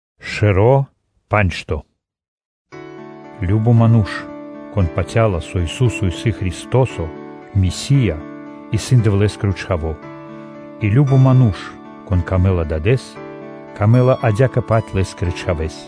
Кажно (сва́ко) ману́ш, кон патя́ла, со Ису́со исын Христо́со (Месия), исын Дэвлэ́скиро чхаво́, и кажно ману́ш, конэ́скэ исын дро́го Дад, лэ́скэ адя́кэ-паць исын дро́го Лэ́скиро Чхаво́.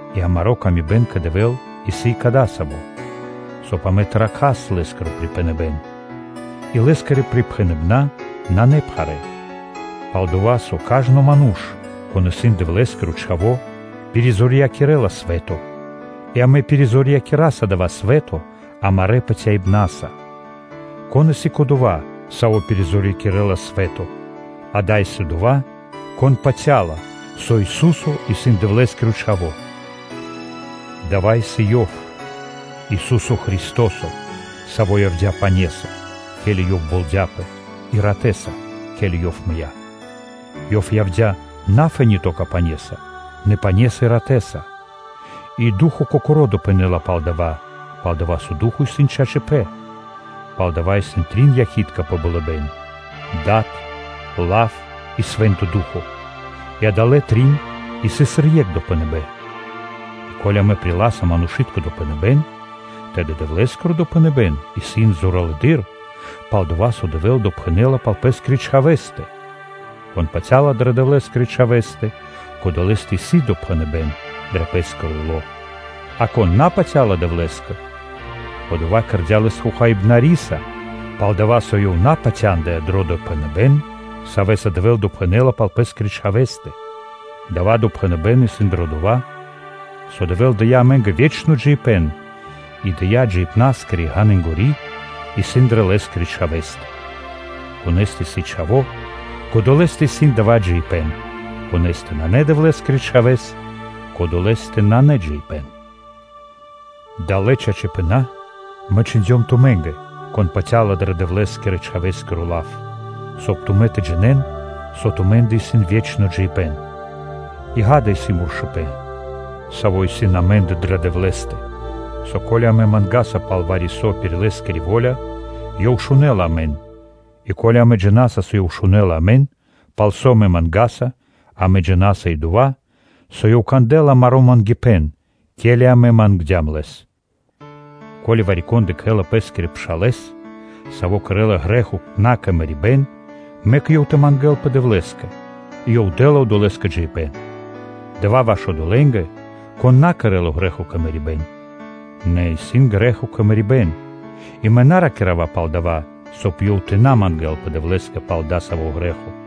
И амари́ паты́в и ило́ кэ Дэвэ́л исын кадасавэ́; соб (кай) амэ тэ ракхас Лэ́скиро припхэныбэ́н. И Лэ́скирэ припхэныбэна́ исын напхарэ. Пал-дова́ со кажно ману́ш, кон исын Дэвлэ́скиро чхаво́, пиризорьякирэла свэ́то. И амэ пиризорьякираса дава́ свэ́то амарэ́ патяибна́са. Кон исын кодова́, саво́ пиризорьякирэла свэ́то: ґа́да (акэ), исын одова́, кон патя́ла, со Ису́со исын Дэвлэ́скиро Чхаво́. Дава́ исын Ёв, Ису́со Христо́со, Саво́ явдя́ пане́са, ке́ли Ёв болдяпэ: и ратэ́са, ке́ли Ёв мыя́. Ёв явдя́ на фэ́ни (то́ка) пане́са, нэ пане́са и ратэ́са. И Ду́хо (Фа́но) Кокоро́ допхэнэ́ла пал дава́, пал-дова́ со Ду́хо (Фа́но) исын чачипэ́н. Палдава́ исын трин якхи́тка пэ болыбэ́н: Дад, Лав и Свэ́нто Ду́хо (Фа́но), и адалэ́ трин исын сыр екх допхэныбэ́н. И ко́ли амэ приласа манушы́тко допхэныбэ́н, тэды Дэвлэ́скиро допхэныбэ́н исын зоралэды́р, пал-дова́ со Дэвэ́л допхэнэ́ла пал Пэ́скирэ Чхавэ́стэ. Кон патя́ла дрэ Дэвлэ́скирэ Чхавэ́стэ, кодолэстэ исын допхэныбэ́н дро пэ́скиро ило́. А кон на патя́ла Дэвлэ́скэ, одова́ кэрдя́ Лэс Хохаибнариса, пал-дова́ со ёв на упатяндыя дро допхэныбэ́н, савэ́са Дэвэ́л допхэнэ́ла пал Пэ́скирэ Чхавэ́стэ. Дава́ допхэныбэ́н исын дро дова́, со Дэвэ́л дыя́ амэ́нгэ ве́чно джиибэ́н и дая́ джиибна́скири ґанынгори исын дрэ Лэ́скирэ Чхавэ́стэ. Конэ́стэ исын Чхаво́, кодолэстэ исын дава́ джиибэ́н; конэ́стэ нанэ Дэвлэ́скирэ Чхавэ́с, кодолэстэ нанэ джиибэ́н. Далэ́ чачипэна́ мэ чхиндём тумэ́нгэ, кон патя́ла дро Дэвлэ́скирэ-Чхавэ́скиро лав, соб (кай) тумэ́ тэ джинэ́н, со тумэ́ндэ исын ве́чно джиибэ́н. И ґа́да, исын муршыпэн, саво́ исын амэ́ндэ дрэ Дэвлэ́стэ, со ко́ли амэ мангаса вари-со пир Лэ́скири во́ля, Ёв шунэ́ла амэн. И ко́ли амэ джина́са, со Ёв шунэ́ла амэн, пал со амэ мангаса, амэ джина́са и дова́, со Ёв кандэ́ла амаро́ мангипэ́н, ке́ли амэ мангдям Лэс. Ко́ли вари-кон бидыкхэла пэ́скирэ пшалэ́с, саво́ кэрэ́ла грэ́хо на кэ мэрибэ́н, мэк ёв тэ мангэ́лпэ Дэвлэ́скэ, и Ёв дэ́ла одолэ́скэ джиибэ́н. Дава́ исын ваш одолэ́нгэ, кон на кэрэ́ла грэ́хо кэ мэрибэ́н. Нэ исын грэ́хо кэ мэрибэ́н: и мэ на ракира́ва пал дава́, соб (кай) ёв тэ мангэ́лпэ Дэвлэ́скэ пал дасаво грэ́хо.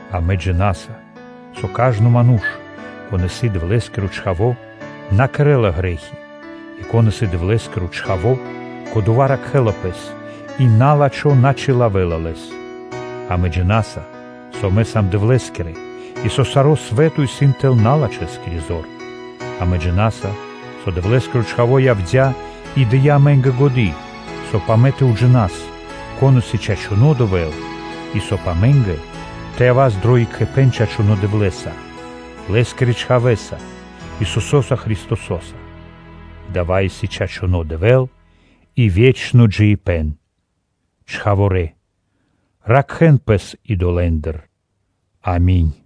Амэ джина́са, со кажно ману́ш, кон исын Дэвлэ́скиро чхаво́, на кэрэ́ла грэ́хи, нэ кон исын Дэвлэ́скиро чхаво́, кодова́ ракхэ́ла пэс, и на́лачхо на чилавэ́ла лэс. Амэ джина́са, со амэ сам Дэвлэ́скирэ, и со саро́ свэ́то исын тэл налачхэскири зор. Амэ джина́са, со Дэвлэ́скиро Чхаво́ явдя́ и дыя́ амэ́нгэ годы́, соб (кай) амэ тэ уджинас, кон исын чачуно́ Дэвэ́л, и соб (кай) амэ́нгэ тэ явас дро екхипэ́н чачунэ́ Дэвлэ́са, Лэ́скирэ Чхавэ́са, Исусо́са Христосо́са. Дава́ исын чачуно́ Дэвэ́л и ве́чно джиибэ́н. Чхаворалэ! Ракхэ́н пэс идолэндыр. Ами́нь.